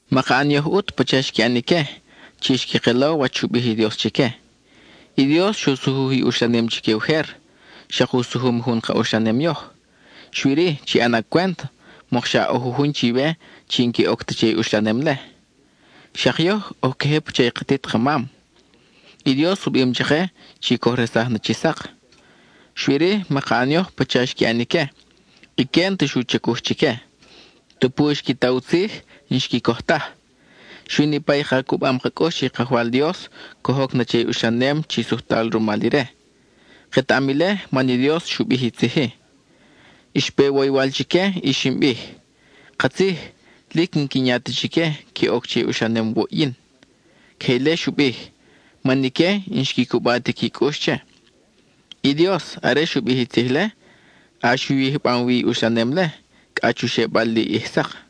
Maka ʼan yoj ʼut pacha xqui ʼan ique, chi xqui kelo wach xu bij i Dios chique. I Dios xu sujuj i uxlanem chique ujer, xak u sujum jun ka uxlanem yoj. Xui-ri, chi ʼana cwent mokxa ʼo jujun chiwe chi n-que oc ta che i uxlanem-le. Xak yoj, oj queje pacha i katit ka mam, i Dios u bim chake chi coj resaj na chi sak. Xui-ri, maka ʼan yoj pacha xqui ʼan ique; ique n-ta xu chacuj chique; tupu xqui ta u tzij, n-xqui coj taj. Xui niʼpa i ka cubam ka cʼux che i Kajwal Dios coj oc na che i uxlanem chi sujtal rumal ire. Ketaʼam ile, man i Dios xu bij i tzij-i: Xpe woywal chique y xin bij: “Katzij, lic n-quin ya ta chique que oc che i uxlanem wuʼ yin.” (Queje ile xu bij, man ique n-xqui cuba ti qui cʼux che.) I Dios, are xu bij i tzij-le, ʼax u yijbam wi i uxlanem-le, cʼa chu xebal li ʼij sak.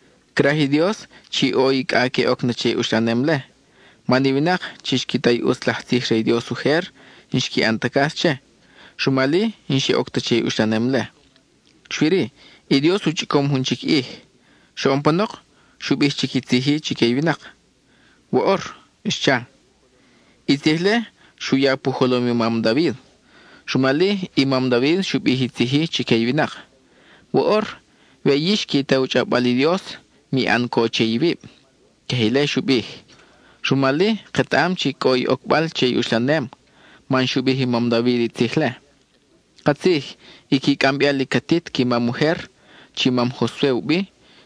Craj i Dios chi ʼo i cʼa que oc na che i uxlanem-le, man i winak chi xqui ta i ʼutz laj tzij re i Dios ujer, n-xqui ʼan ta cas che, rumal-i, n-xe oc ta che i uxlanem-le. Xui-ri, i Dios u chʼicom jun chic ʼij. Xoʼon panok xu bij chic i tzij-i chique i winak; “woʼor” xcha. I tzij-le xu ya pu jolom i mam David. Rumal-i, i mam David xu bij i tzij-i chique i winak: Woʼor, we yix qui ta u chʼawbal i Dios, mi ʼan co che iwib. (Queje ile xu bij.) (Rumal-i, ketaʼam chi cʼo i ocbal che i uxlanem, man xu bij i mam David i tzij-le.) Katzij, i qui cʼambeal i catit qui mam ujer, chi mam Josue u bi,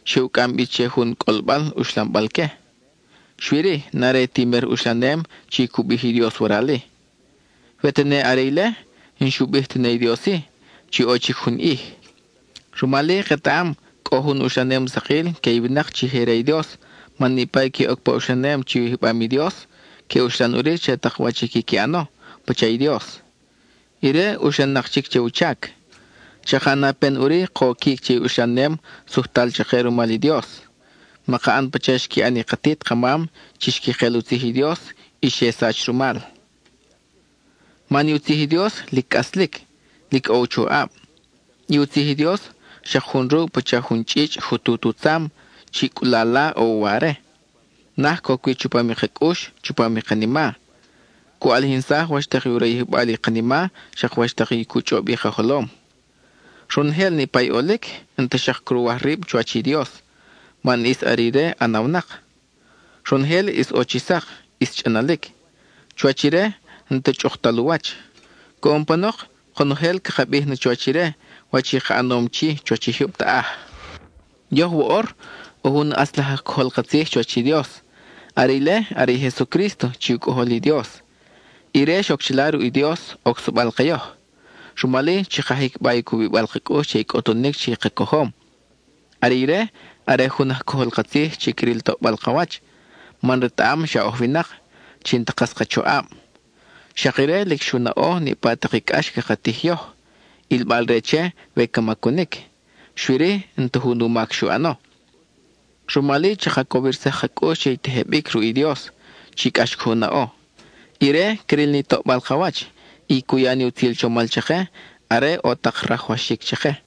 xe u cʼam bi che jun cʼolbal uxlambal que. Xui-ri, n-are ti mer uxlanem chi cu bij i Dios waral-i. We tene are ile, n-xu bij tene i Dios-i, chi ʼo chic jun ʼij. Rumal-i ketaʼam cʼo jun uxlanem sakil que i winak chi je re i Dios man niʼpa i que oc pa uxlanem chi u yijbam i Dios, que uxlan ʼuri che tak wach i quiqui ʼano, pacha i Dios; ire uxlan-nak chic che u chac. Chaka ʼana pen ʼuri koquic che i uxlanem sujtal chake rumal i Dios. Maka ʼan pacha xqui ʼan i katit ka mam chi xqui kel u tzij i Dios y xe sach rumal. Man i u tzij i Dios lic cʼaslic; lic ʼo u choʼab. I u tzij i Dios xak jun ruʼ pacha jun chʼichʼ jutut u tzam, chi cʼulala ʼo u ware; naj coc wi chupam i ka cʼux, chupam i kanima. Cu ʼalijinsaj wach tak u rayijbal i kanima, xak wach tak i cu chʼob i ka jolom. Ronojel niʼpa i ʼolic, n-ta xak cruwaj rib chuwach Dios man ʼis are ire ʼanawnak. Ronojel ʼis ʼo chi sak, ʼis chʼanalic; chuwach ire n-ta chʼuktal u wach. Coʼon panok konojel caka bij na chuwach ire wach i ka ʼanom chi chuwach i jyub taʼaj. Yoj woʼor, ʼo jun ʼatz laj aj cojol ka tzij chuwach i Dios; are ile, are i Jesucrísto chi u Cʼojol i Dios. Ire xoc chila ruʼ i Dios, ocsabal ke yoj. Rumal-i chaka jicba i cubibal ka cʼux che i cʼutunic chi ka cojom. Are ire, are jun aj cojol ka tzij chi cril toʼbal ka wach, man retaʼam xa oj winak, chi n-ta kas ka choʼab. Xak ire lic xu naʼo niʼpa tak i cʼax caka tij yoj, ʼilbal-re che we ca macunic; xui-ri, n-ta jun u mac xu ʼano. Rumal-i chaka cowirsaj ka cʼux che i tejebic ruʼ i Dios, chi cʼax coj u naʼo. Ire cril ni toʼbal ka wach y cu ya ni utzil chomal chake, are ʼo tak rajwaxic chake.